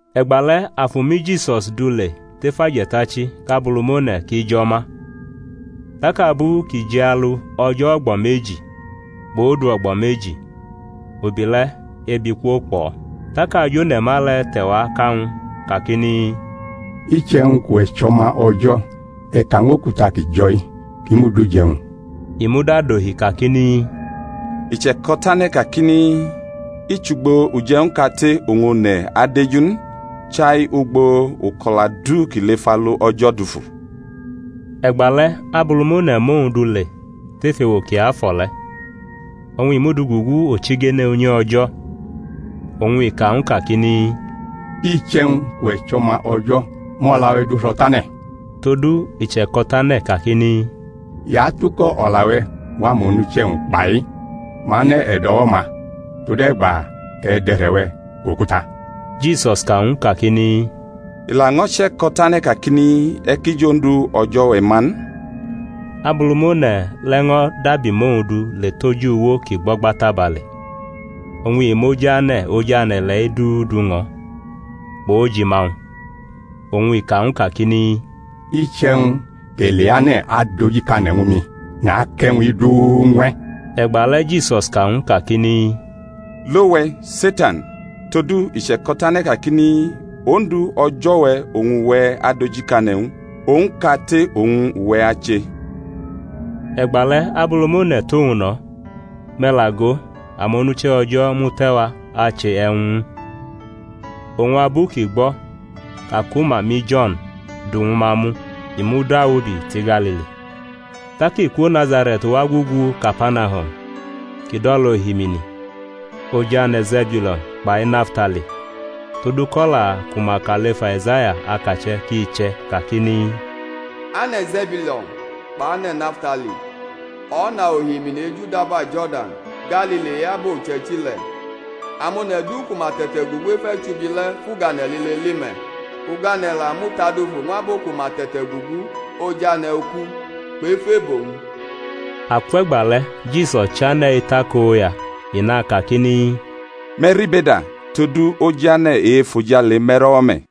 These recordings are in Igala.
E̩gbale̩ Afu mʼiJisus du le tef aje̩tachi kʼAbulumone̩ ki jʼo̩ ma. Tak abu kʼi jialu o̩jo̩ o̩gbo̩ meji, kpʼodu o̩gbo̩ meji, ubi le̩ ebi kwokpʼo̩. Tak ajone̩ma le̩ te̩ wa ka ñw u, kakini, Iche̩wñ kʼuwe̩ chʼO̩ma O̩jo̩, e̩ ka ñw okuta ki jo̩-i ki mud uje̩wñ. I muda dohi kakini, I che̩ko̩tane̩ kakini, I chʼugbo uje̩wñ kate oñ one̩ adeju n, chai ugbo uko̩la du kʼi lef alu O̩jo̩ dufu. E̩gbale̩ Abulumone̩ mʼowñ du le tef ewo kiafo̩ le̩, oñ i mʼu du gugu ochigene unyi O̩jo̩, oñ i ka ñw u kakini, Iche̩wñ kʼuwe̩ chʼO̩ma O̩jo̩, mʼo̩la-we̩ du ro̩ tane̩; todu i che̩ko̩tane̩ kakini, I atuko̩ o̩la-we̩ ñw amonuche̩-wñ, kpai, Ma anʼe̩ e̩do̩wo̩-ma tode̩gba kʼe̩ dʼe̩re̩-we̩ kʼokuta. Jisus ka ñw u kakini, I laño̩ che̩ko̩tane̩ kakini, E̩ ki jʼOndu O̩jo̩-we̩ ma n. Abulumone̩ le̩ ño̩ dabi mʼowñ du le tʼoj uwo kʼi gbo̩gba tabale, oñ i mʼojane̩, ojane̩ ile̩-i du du ñʼo̩, kpʼojima-wñ. Oñ i ka ñw u kakini, Iche̩wñ kʼe̩ leane̩ adojikane̩ ñwu mi, nakʼe̩wñ-i du ñw e̩. E̩gbale̩ Jisus ka ñw u kakini, Lo we̩, Setan! todu i che̩ko̩tane̩ kakini, Ondu, O̩jo̩-we̩, oñ uwe̩ adojikane̩ ñw u, owñ kate oñ uwe̩ ache. E̩gbale̩ Abulumone̩ tʼowñ no̩; me̩ la go, amonuche̩ O̩jo̩ mute̩wa ache e̩wñ ñw u. Oñ abu kʼi gbo̩ ka ku ma mʼiJo̩n du ñwu ma mu, i mudawubi tʼiGalili. Tak i kwo Nazare̩t wa gugu Kapanahum kʼi dʼo̩lʼohimini, ojane̩ Ze̩biulo̩n kpai Naftali; todu kʼo̩la ku ma ka lef Aizaya akache̩ kʼi che̩ kakini, Ane̩ Ze̩biulo̩n kpʼane̩ Naftali, o̩na ohimini ejudaba Jo̩rdan, Galili e-abo uche̩ichi le̩, amone̩ du ku ma te̩te̩ gugu ef e̩chubi le̩ fʼugane̩ lile li me̩; ugane̩ la mutadufu ñw abo ku ma te̩te̩gugu oj ane̩ uku kpʼef e̩bo-wñ. Akwe̩gba le̩ Jisus chane̩ etakoya, i nakakini, Me̩ ribeda; todu ojane̩ e-efojale me̩ro̩wo̩ me̩.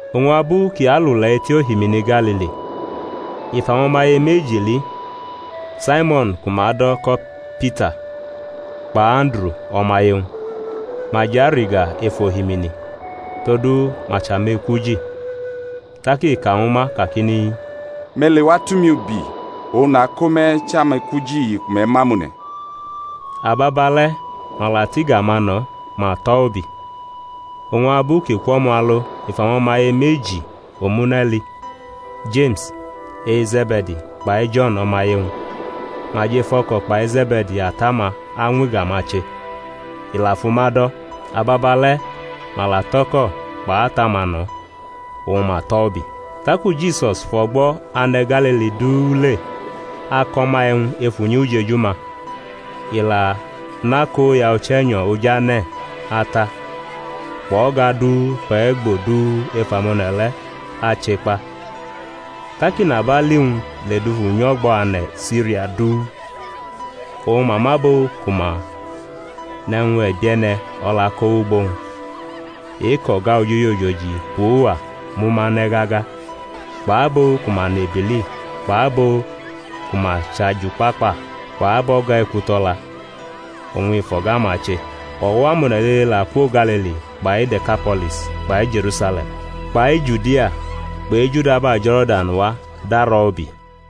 Oñ abu kʼi alule̩ etʼohimini Galili, i fʼamo̩maye meji li, Saimo̩n ku ma do̩ ko̩ iPita kpʼAnduru, o̩maye-wñ; ma jʼarʼiga ef ohimini; todu ma chʼamekwuji. Tak i ka ñwu ma kakini, Me̩ lewa tʼumi ubi, oñ nako me̩ chʼamekwuji ku me̩ mʼamone̩. Ababale̩ ma la tʼiga-ma no̩, ma tʼo̩ ubi. Oñ abu kʼi kwʼo̩mo̩ alo i fʼamo̩maye meji omune̩ li, Jeme̩s e-Ze̩be̩di kpai Jo̩n o̩maye-wñ; ma jʼef o̩ko̩ kpai Ze̩be̩di ata-ma añwʼiga-ma che. I la fʼuma do̩. Ababale̩ ma la tʼo̩ko̩ kpʼata-ma no̩, oñ ma tʼo̩ ubi. Taku Jisus fʼo̩gbo̩ ane̩ Galili du le ako̩ ma e̩wñ ef unyi ujeju-ma. I la nʼakoya Uche̩nyo̩ Ojane̩ ata, kpʼo̩ga du kpʼe̩gbo du ef amone̩ le̩ ache kpa. Tak inabali-wñ ledufu nyʼo̩gbo̩ ane̩ Siria du, oñ ma mʼabo ku ma nʼe̩wñ e̩bie̩ne̩ o̩la ko wʼugbo-wñ, e-kʼo̩ga ojoji ojoji kpʼuwa mʼuma ne̩ gaga, kpʼabo ku ma nʼebili kpʼabo ku ma chʼajukpakpa kpʼabo̩ga ekuto̩la; oñ i fʼo̩ga-ma che. O̩wo̩ amone̩ lile la kwo Galili kpai De̩kapo̩lis kpai Je̩rusale̩m kpai Judia kpʼejudaba Jo̩rdan wa darʼo̩ ubi.